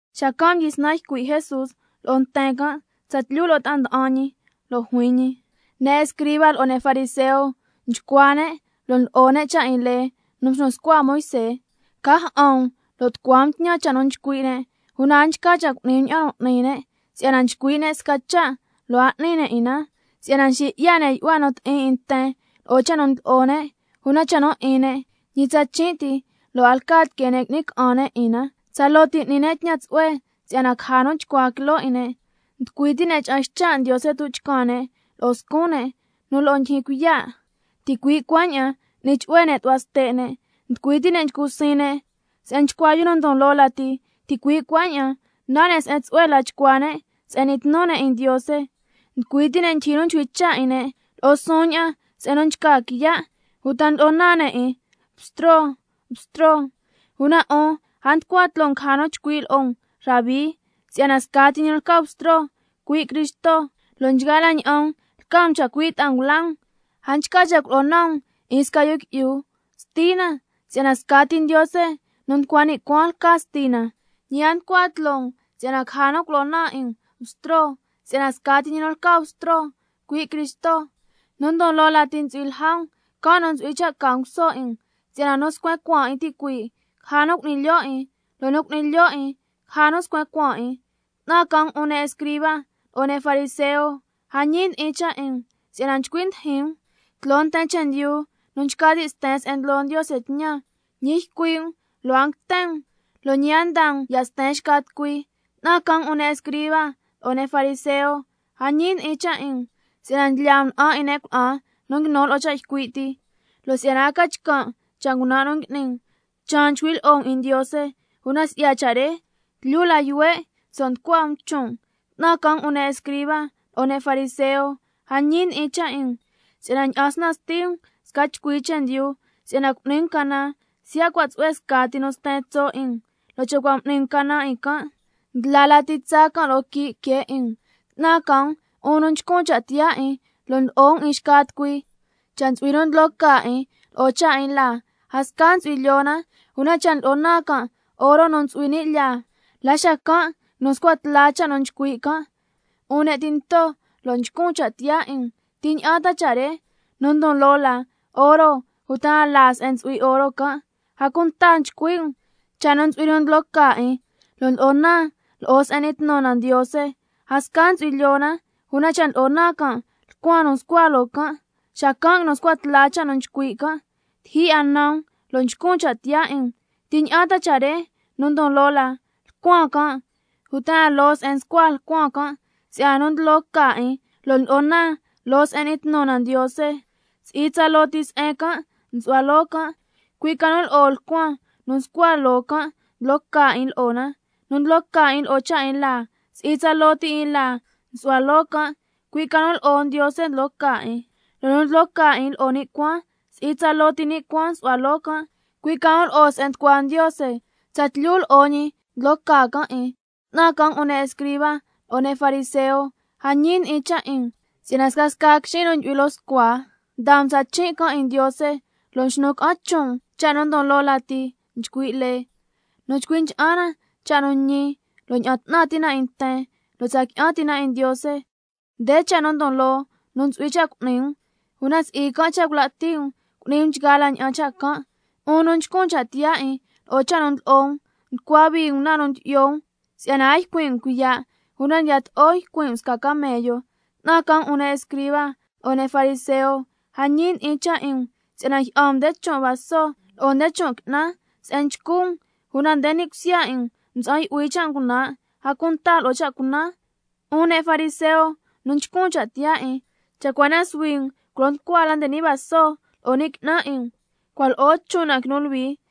Xacan' mdyisnan ycui' Jesús lo'o nten can' tsatlyu lo'o ta'a nda'an ñi, lo' juin ñi: Ne' escriba lo'o ne' fariseo nchcua ne', lo' ndlo'o ne' cha' 'in lee nu mxnu scua Moisé. Ca ja'an um lo' tucua um tñan cha' nu nchcui' ne', una a nchca cha' cu'ni um ña'an nu n'ni ne', si'yana nchcui' ne' sca cha' lo' a n'ni ne' 'in na. Si'yana nxi 'ya ne' yu'hua nu ti'in 'in nten lo'o cha' nu ndlo'o ne', una cha' nu 'in ne', ñi tsachin' ti lo' a lca tiquee ne' qui'ni ca'an ne' 'in na. Tsaloo ti n'ni ne' tñan tsu'hue si'yana caja nu chcua quiloo 'in ne', nducui ti' ne' ncha'an ycha' Ndiose tuchcan ne' lo'o scun ne', lyee la que ña'an nu ntsu'hui ca cha' cu'ni ne', ticui' cuaña'an n'ni chu'hue ne' tu'hua ste' ne'. Nducui ti' ne' nchcu siin ne' se'en nchcua yu nu ndon loo lati, ticui' cuaña'an nan ne' se'en tsu'hue la nchcua ne' se'en n'ni tnu ne' 'in Ndiose. Nducui ti' ne' ndyijyi nu chcui' cha' 'in ne' lo'o suun ña'an se'en nchca quiya', uta ndlo'o naan ne' 'in: Bstro, Bstro. Una 'un a tucua tloo um caja nu chcui' lo'o um, Bstro, si'yana scati ñi nu lca Bstro, cui' Cristo, lo' nchgaa la ña'an um lca um chacui' ta'a ngula um. A nchca cha' culo'o naan um 'in sca yu qui'yu, Stina, si'yana scati Ndiose nu nducua ni' cuaan lca Stina. Ñi a tucua tloo um si'yana caja nu culo'o naan 'in um, Bstro, si'yana scati ñi nu lca Bstro, cui' Cristo. Nu ndon loo lati ntsu'hui lja um, can' nu ntsu'hui cha' ca nguso 'in um. Si'yana nu scuen cuaan 'in ticuii', caja nu cu'ni lyo' 'in, lo' nu cu'ni lyo' 'in caja nu scuen cuaan 'in. ¡'Tnan ca 'un ne' escriba lo'o ne' fariseo, a ñi ndi'in cha' 'in um! Si'yana nchcui ndijin um tloo nten chendyu nu nchca ti' sten se'en ndlo Ndiose tñan, ñi ycui' um lo' a nguiten um lo' ñi a ndaa um ya' sten nten. ¡'Tnan ca 'un ne' escriba lo'o ne' fariseo, a ñi ndi'in cha' 'in um! Si'yana ndlyaa um na'an 'in ne' cuna'an nu nguinu lo'o cha' ycui' ti, lo' si'yana a ca chcan' cha' ngunan' nu ngui'ni um, can' cha' chaan nchcui' lyi'o um 'in Ndiose, una si'ya cha' re tlyu la yuhue' nso' tucua um chon' um. ¡'Tnan ca 'un ne' escriba lo'o ne' fariseo, a ñi ndi'in cha' 'in um! Si'yana ndyi'an snan sti um sca chcui chendyu si'yana cu'ni um canan siya' cua' tsu'hue scati nu sten tso' 'in um, lo' cha' cua' m'ni um canan 'in can', ndla lati tsaa can' loo quii' que 'in um. ¡'Tnan ca 'un nu nchcun cha' tiyaa 'in, lo' ndlo'o um 'in xca tucui! Cha' ntsu'hui nu ndlo ca 'in lo'o cha' 'in laa, a sca ntsu'hui lyoo na, una cha' ndlo'o naan can' oro nu ntsu'hui ni' lyaa, la xacan' nguinu scua tla cha' nu nchcui' can'. ¡'Un ne' tinto lo' nchcun cha' tiyaa 'in um! ¿Ti ña'an ta cha' re nu ndon loo la, oro uta na laa se'en ntsu'hui oro can'? A cunta nchcui' um: Cha' ntsu'hui nu ndlo ca 'in, lo' ndlo'o naan loo se'en n'ni tnu na Ndiose, a sca ntsu'hui lyoo na, una cha' ndlo'o naan can' lcuan nu nscua loo can', xacan' nguinu scua tla cha' nu nchcui' can'. ¡Tiji 'a nan um lo' nchcun cha' tiyaa 'in um! ¿Ti ña'an ta cha' re nu ndon loo la, lcuan can' uta na se'en ndyi'ya na lcuan tloo Ndiose? Si'yana nu ndlo ca 'in, lo' ndlo'o naan loo se'en n'ni tnu na Ndiose, si'i tsaloo ti se'en can' nsu'hua loo can', cui' ca nu lo'o lcuan nu nscua can' ndlo ca 'in lo'o na. Nu ndlo ca 'in lo'o cha' 'in laa, si'i tsaloo ti 'in laa nsu'hua loo can', cui' ca nu lo'o Ndiose ndlo ca 'in. Lo' nu ndlo ca 'in lo'o ni' cuaan, si'i tsaloo ti ni' cuaan nsu'hua loo can', cui' ca nu lo'o se'en nducua Ndiose, tsatlyu lo'o ñi ndlo ca can' 'in. ¡'Tnan ca 'un ne' escriba lo'o ne' fariseo, a ñi ndi'in cha' 'in um! Si'yana scasca quixin' nu ndyu'hui loo scua ndaa um tsachin' can' 'in Ndiose, lo' nxnu ca'an chon' um cha' nu ndon loo lati nchcui' lee: Nu chcui ncha'an na cha' nu ñi, lo' ña'an 'tnan ti' na 'in nten, lo' tsa qui'an ti' na 'in Ndiose. Nde cha' nu ndon loo nu ntsu'hui cha' cu'ni um, una si'i can' cha' cula' ti' um cu'ni um nchgaa la ña'an cha' can'. ¡'Un nu nchcun cha' tiyaa 'in lo'o cha' nu ndlo'o um! Nducua hui um na nu ndyi'yo um si'yana a ycuin' um cuiya', una ndiyato'o ycuin' um sca camello. ¡'Tnan ca 'un ne' escriba lo'o ne' fariseo, a ñi ndi'in cha' 'in um! Si'yana njyi'an um nde chon' vaso lo'o nde chon' qui'nan se'en nchcu um, una nde ni' cusya 'in um mtsa'an yu'hui cha' ngunan', a cunta lo'o cha' cunan. ¡'Un ne' fariseo nu nchcun cha' tiyaa 'in! Cha' cua na suhui um culo nducua la nde ni' vaso lo'o qui'nan 'in um, cuaña'an lo'o chon' na quinu luhui.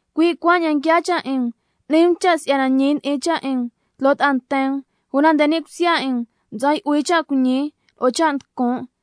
Cui' cuaña'an nguiaa cha' 'in um, n'ni um cha' si'yana ñi ndi'in cha' 'in um tloo ta'a nten um, una nde ni' cusya 'in um mtsa'an yu'hui cha' cuiñi lo'o cha' nducun'.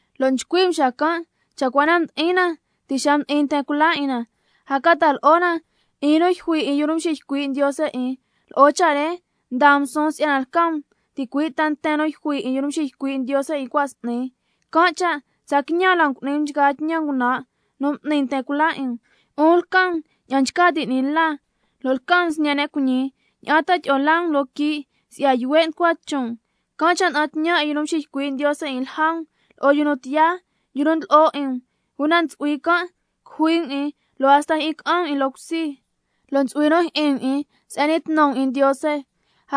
lo' nchcui' um xacan': Cha' cua na mdi'in na ti' xa mdi'in nten cula 'in na, a ca ta'a lo'o na 'in nu yjui 'in yu nu mxiycui' Ndiose 'in. Lo'o cha' re ndaa um suun si'yana lca um ticui' ta nten nu yjui 'in yu nu mxiycui' Ndiose 'in cua' s'ni. Can' cha' tsa quiñan la um cu'ni um nchgaa tñan ngunan' nu m'ni nten cula 'in um. ¡'Un lca um ña'an nchca ti' 'ni la, lo' lca um sñe' ne' cuiñi! ¿Ña'an ta tyi'o laa um loo quii' si'ya yuhue' nducua chon' um? Can' cha' nda'an tñan 'in yu nu nxiycui' Ndiose 'in lja um, lo'o yu nu tiyaa, yu nu ndlo'o 'in um. Una ntsu'hui can' cujui um 'in lo' hasta jyi'in ca'an um 'in loo cusi, lo' ntsu'hui nu jyi'in um 'in se'en n'ni tnu um 'in Ndiose,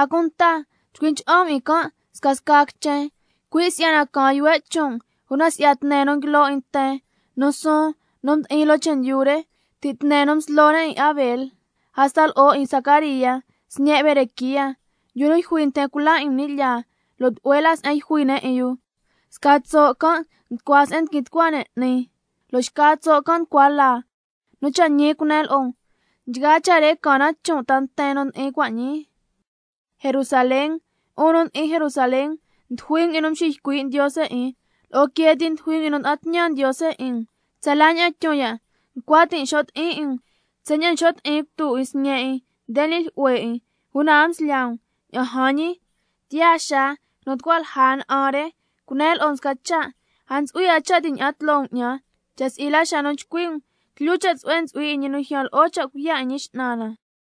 a cunta chcui ncha'an um 'in can' scasca quichen, cui' si'yana caan yuhue' chon' um si'ya nchgaa tne nu nguilo 'in nten nu suun nu mdi'in loo chendyu re, ti' tne nu mslo ne' 'in Abel hasta lo'o nu 'in Zacaría, sñe' Berequía, yu nu yjui nten cula 'in um ni' lyaa. Lo' tlu'hue la se'en yjui ne' 'in yu, sca tso' can' nducua se'en ndiquin tucua ne' 'ni, lo' xca tso' can' nducua laa. Nu cha' ñi cunen lo'o um, nchgaa cha' re caan na chon' ta nten nu ndi'in cua' ñii. ¡Jerusalén, 'un nu ndi'in Jerusalén, ndujui um 'in nu nxiycui' Ndiose 'in, lo'o quee ti ndujui um 'in nu nda'an tñan Ndiose 'in um. Tsala ña'an tyun ya' ncua tin' xo' ti'in 'in um, tsaña'an nxo' ti'in cutu 'in sñe' 'in nde ni' jlyu'hue 'in, una a mslyaa um. Ña'an jan ñi, —tiyaa xaa quinu tucua lja na'an re—. Cunen lo'o um sca cha', a ntsu'hui 'a cha' ña'an tloo um 'ñan, cha' si'i la xa nu chcui' um: —Tlyu cha' tsu'hue ntsu'hui 'in ñi nu ljyaan lo'o cha' cuiya' 'in Ñi X'nan na—.